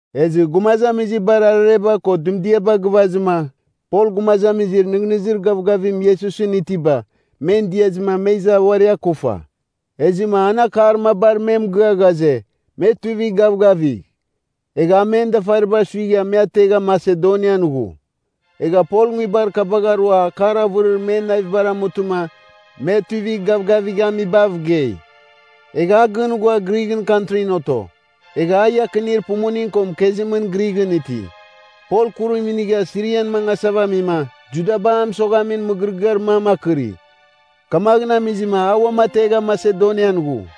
Ezɨ gumazamizibar arareba ko dɨmdiaba gɨvazɨma, Pol gumazamizir nɨghnɨzir gavgavim Iesusɨn itiba, men diazɨma me iza uari akufa. Ezɨma an akar mabar me mɨgɨa ghaze, me tuivigh gavgavigh. Egha a men dafariba suigha me ategha Masedonian ghu. Egha Pol nguibar kabagh arua akar avɨrir men navibar amutɨma me tuivigh gavgavighamibav gei. Egha a gɨn ghua Grighɨn kantrin oto. Egha a iakinir pumuning ko mɨkezimɨn Grighɨn iti. Pol kurim inigha Sirian mangasava amima, Judaba a mɨsoghamin mɨgɨrɨgɨar mam akɨri. Kamaghɨn amizɨma, a uam ategha Masedonian ghu.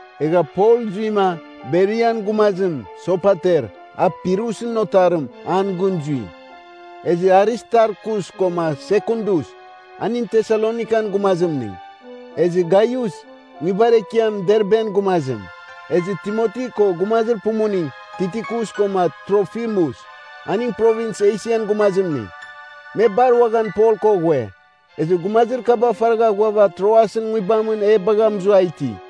Egha Pol zuima, Berian gumazim, Sopater, a Pirusɨn otarim, an gɨn zui. Ezɨ Aristarkus koma Sekundus, aning Tesalonikan gumazimning. Ezɨ Gaius, nguibar ekiam Derben gumazim. Ezɨ Timoti ko gumazir pumuning, Tikikus koma Trofimus, aning Provins Esian gumazimning, me bar uaghan Pol ko ghue. Ezɨ gumazir kaba faragha ghuava Troasɨn nguibamɨn e bagha mɨzua iti.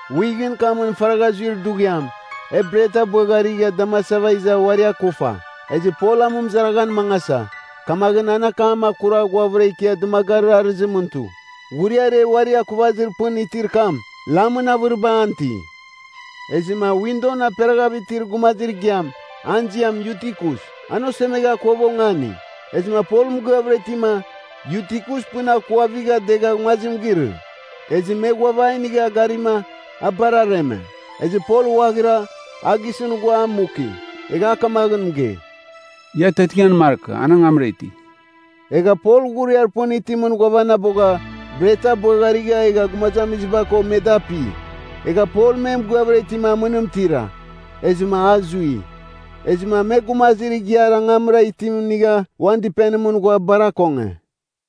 Wighɨn kamɨn faragha zuir dughiam, e bret abɨagharigha damasava iza uari akufa. Ezɨ Pol amɨmɨzaraghan mangasa, kamaghɨn an akam akura ghuavɨra ikia dɨmagarir arɨzimɨn tu. Ghuriar e uari akuvazir pɨn itir kam, lamɨn avɨriba an iti. Ezɨma windon aperaghav itir gumazir igiam, an ziam Yutikus, an osemegha akuava ongani. Ezɨma Pol mɨgɨavɨra itima, Yutikus pɨn akuavigha degha nguazim girɨ. Ezɨ me ghuava a inigha garima, a bar areme. Ezɨ Pol ghuaghira, a gisɨn ghua a muki. Egha a kamaghɨn mɨgei, “Ia atiatingan markɨ. An angamra iti.” Egha Pol ghuriar pɨn itimɨn ghuavanabogha, bret abɨagharigha egha gumazamiziba ko me da api. Egha Pol me mɨgɨavɨra itima amɨnim tira. Ezɨma a zui. Ezɨma me gumazir igiar angamra itim inigha uan dɨpenimɨn ghua bar akonge.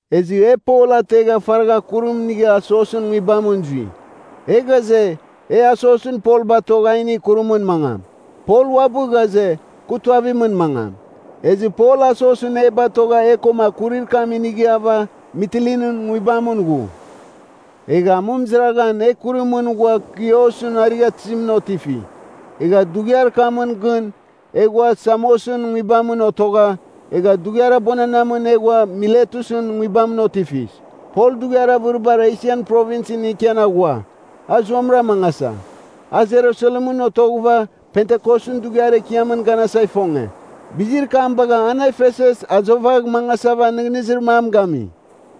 Ezɨ e Pol ategha faragha kurim inigha Asosɨn nguibamɨn zui. E ghaze, e Asosɨn Pol batogh a inigh kurimɨn mangam. Pol uabɨ ghaze, kɨ tuavimɨn mangam. Ezɨ Pol Asosɨn e batogha e koma kurir kam inighava Mitilinɨn nguibamɨn ghu. Egha amɨmɨzaraghan e kurimɨn ghua Kiosɨn arighatɨzimɨn otifi. Egha dughiar kamɨn gɨn e ghua Samosɨn nguibamɨn otogha, egha dughiar abuananamɨn e ghua Miletusɨn nguibamɨn otifis. Pol dughiar avɨribar Esian Provinsɨn ikian aghua, a zuamɨra mangasa. A Jerusalemɨn otoghɨva, Pentikosɨn Dughiar Ekiamɨn ganasa ifonge. Bizir kam bagha an Efesus azovagh mangasava nɨghnɨzir mam gami.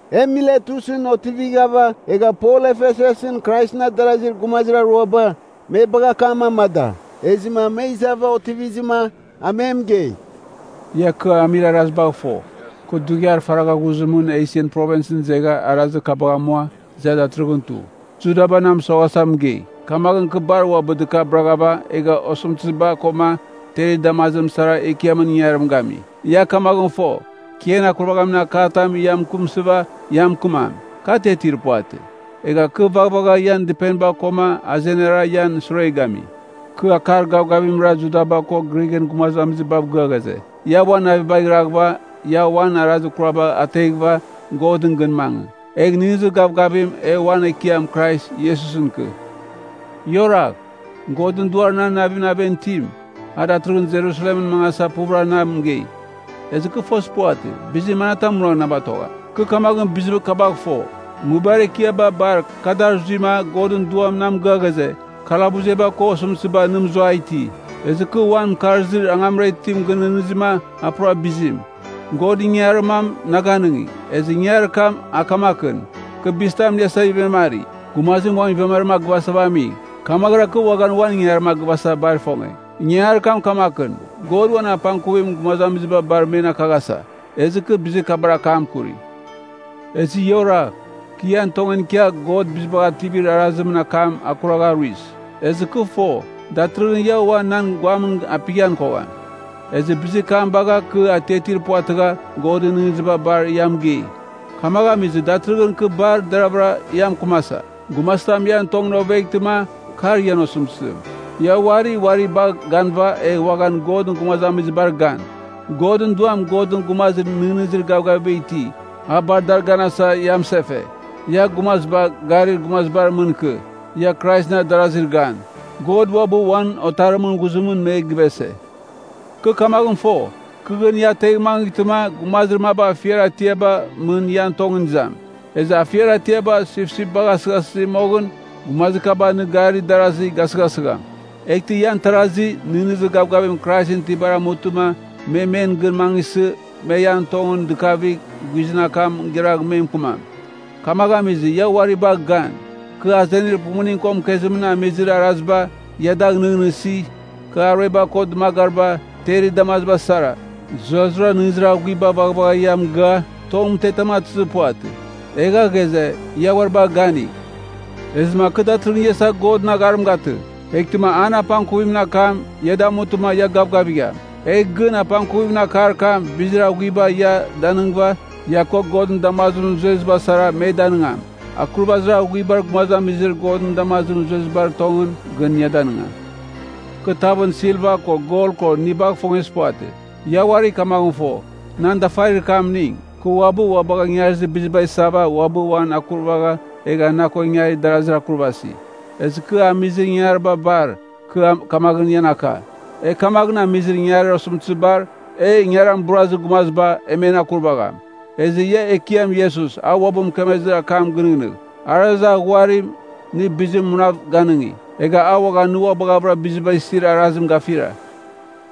E Miletusɨn otivighava egha Pol Efesusɨn Kraisɨn adarazir gumazir aruaba, me bagha akam amada. Ezɨma me izava otivizɨma, a me mɨgei, “Ia kɨ amir arazibagh fo, kɨ dughiar faragha ghuzimɨn Esian Provinsɨn izegha arazir kabagh amua, iza datɨrɨghɨn tu. Judaba na mɨsoghasa mɨgei. Kamaghɨn kɨ bar uabɨ dɨkabɨraghava egha osɨmtɨziba koma terir damazim sara Ekiamɨn ingangarim gami. Ia kamaghɨn fo, kɨ ian akurvaghamin akar tam ia mɨkɨmsɨva ia mɨkɨmam, kɨ atiatir puvatɨ. Egha kɨ vaghvagha ian dɨpeniba koma azenara ian sure gami. Kɨ akar gavgavimra Judaba koma Grighɨn gumazamizibav gɨa ghaze, ia uan navibagh iraghɨva ia uan arazir kuraba ateghɨva Godɨn gɨn mangɨ, egh nɨghnɨzir gavgavim e uan Ekiam Krais Iesusɨn ikɨ. “Ia oragh, Godɨn Duar nan aven itim, a datɨrɨghɨn Jerusalemɨn mangasava puvɨra na mɨgei. Ezɨ kɨ fozir puvatɨ, bizir manatam munagh na batogham. Kɨ kamaghɨn bizir kabagh fo, nguibar ekiaba bar ka dar zuima Godɨn Duam na mɨgɨa ghaze, kalabusba ko osɨmtɨziba na mɨzua iti. “Ezɨ kɨ uan mɨkarzir angamra itim gɨnɨghnɨzima a pura bizim. God ingangarir mam na ganɨngi. Ezɨ ingangarir kam kamakɨn, kɨ bizitam iniasa ivemari. Gumazim uan ivemarim a gɨvasava ami, kamaghɨra kɨ uaghan uan ingangarim a gɨvasa bar ifonge. Ingangarir kam kamakɨn, God uan apangkuvim gumazamiziba bar men akakaghasa. Ezɨ kɨ bizir kabar akam akuri. “Ezɨ ia oragh. Kɨ ian tongɨn ikia God Bizibagh Ativir Arazimɨn akam akuragha aruis. Ezɨ kɨ fo, datɨrɨghɨn ia ua nan guamɨn apighan kogham. Ezɨ bizir kam bagha kɨ atiatir puvatɨgha Godɨn nɨghnɨziba bar ia mɨgei. Kamaghɨn amizɨma, datɨrɨghɨn kɨ bar deraghvɨra ia mɨkɨmasa, gumazitam ian tongɨn oveghtɨma, kar ian osɨmtɨzim. Ia uari uari bagh ganɨva, egh uaghan Godɨn gumazamizibar gan. Godɨn Duam Godɨn gumazir nɨghnɨzir gavgaviba iti, a bar dar ganasa ia mɨsefe. Ia gumaziba gari gumazibar mɨn ikɨ, ia Kraisɨn adarazir gan. God uabɨ uan Otarimɨn ghuzimɨn me givese. Kɨ kamaghɨn fo, kɨ gɨn ia ategh mangɨghtɨma, gumazir maba afiar atiaba mɨn ian tongɨn izam. Ezɨ afiar atiaba sipsip bagha asɨghasɨzi moghɨn, gumazir kaba nɨ garir darazi gasɨghasɨgham. Eghtɨ ian tarazi, nɨghnɨzir gavgavim Kraisɨn itibar amutɨma, me men gɨn mangɨsɨ, me ian tongɨn dɨkavigh guizɨn akam giragh me mɨkɨmam. Kamaghɨn amizɨma, ia uari bagh gan. Kɨ azenir pumuning ko mɨkezimɨn amizir araziba, ia dagh nɨghnɨsi. Kɨ arueba ko dɨmagariba, terir damazim sara, zurazurara nɨghnɨzir aghuiba vaghvagha ia mɨgɨa, tong mɨtetam atɨzɨ puvatɨ. Egha ghaze, ia uari bagh ganigh. “Ezɨma kɨ datɨrɨghɨn ia isava Godɨn agharim gatɨ, eghtɨma an apangkuvimɨn akam ia damutɨma ia gavgavigham. Egh gɨn apangkuvimɨn akar kam, bizir aghuiba ia danɨngɨva, ia ko Godɨn damazimɨn zueziba sara me danɨngam. akurvazir aghuibar gumazamizir Godɨn damazim zuezibar tongɨn gɨn ia danɨngam. “Kɨ tavɨn silva ko gol ko inibagh ifongezir puvatɨ. Ia uari kamaghɨn fo, nan dafarir kamning, kɨ uabɨ ua bagha ingarir biziba isava uabɨ uan akurvagha egha na ko ingarir darazir akurvasi. Ezɨ kɨ amizir ingangariba bar, kɨ kamaghɨn ian aka, e kamaghɨn amizir ingangarir osɨmtɨzibar, e ingaran iburazir gumaziba, e men akurvagham. Ezɨ ia Ekiam Iesus, a uabɨ mɨkemezir akam gɨnɨghnɨgh, ‘Arazir aghuarim, nɨ bizim munav ganɨngi. Egha a uaghan nɨ ua baghɨvɨra biziba isir arazim gafira.’”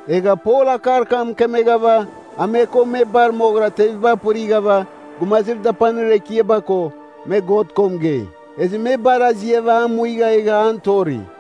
Egha Pol akar kam mɨkemeghava, a me ko me bar moghɨra teviba apɨrighava, gumazir dapanir ekiaba ko, me God ko mɨgei. Ezɨ me bar aziava a muigha egha an tori.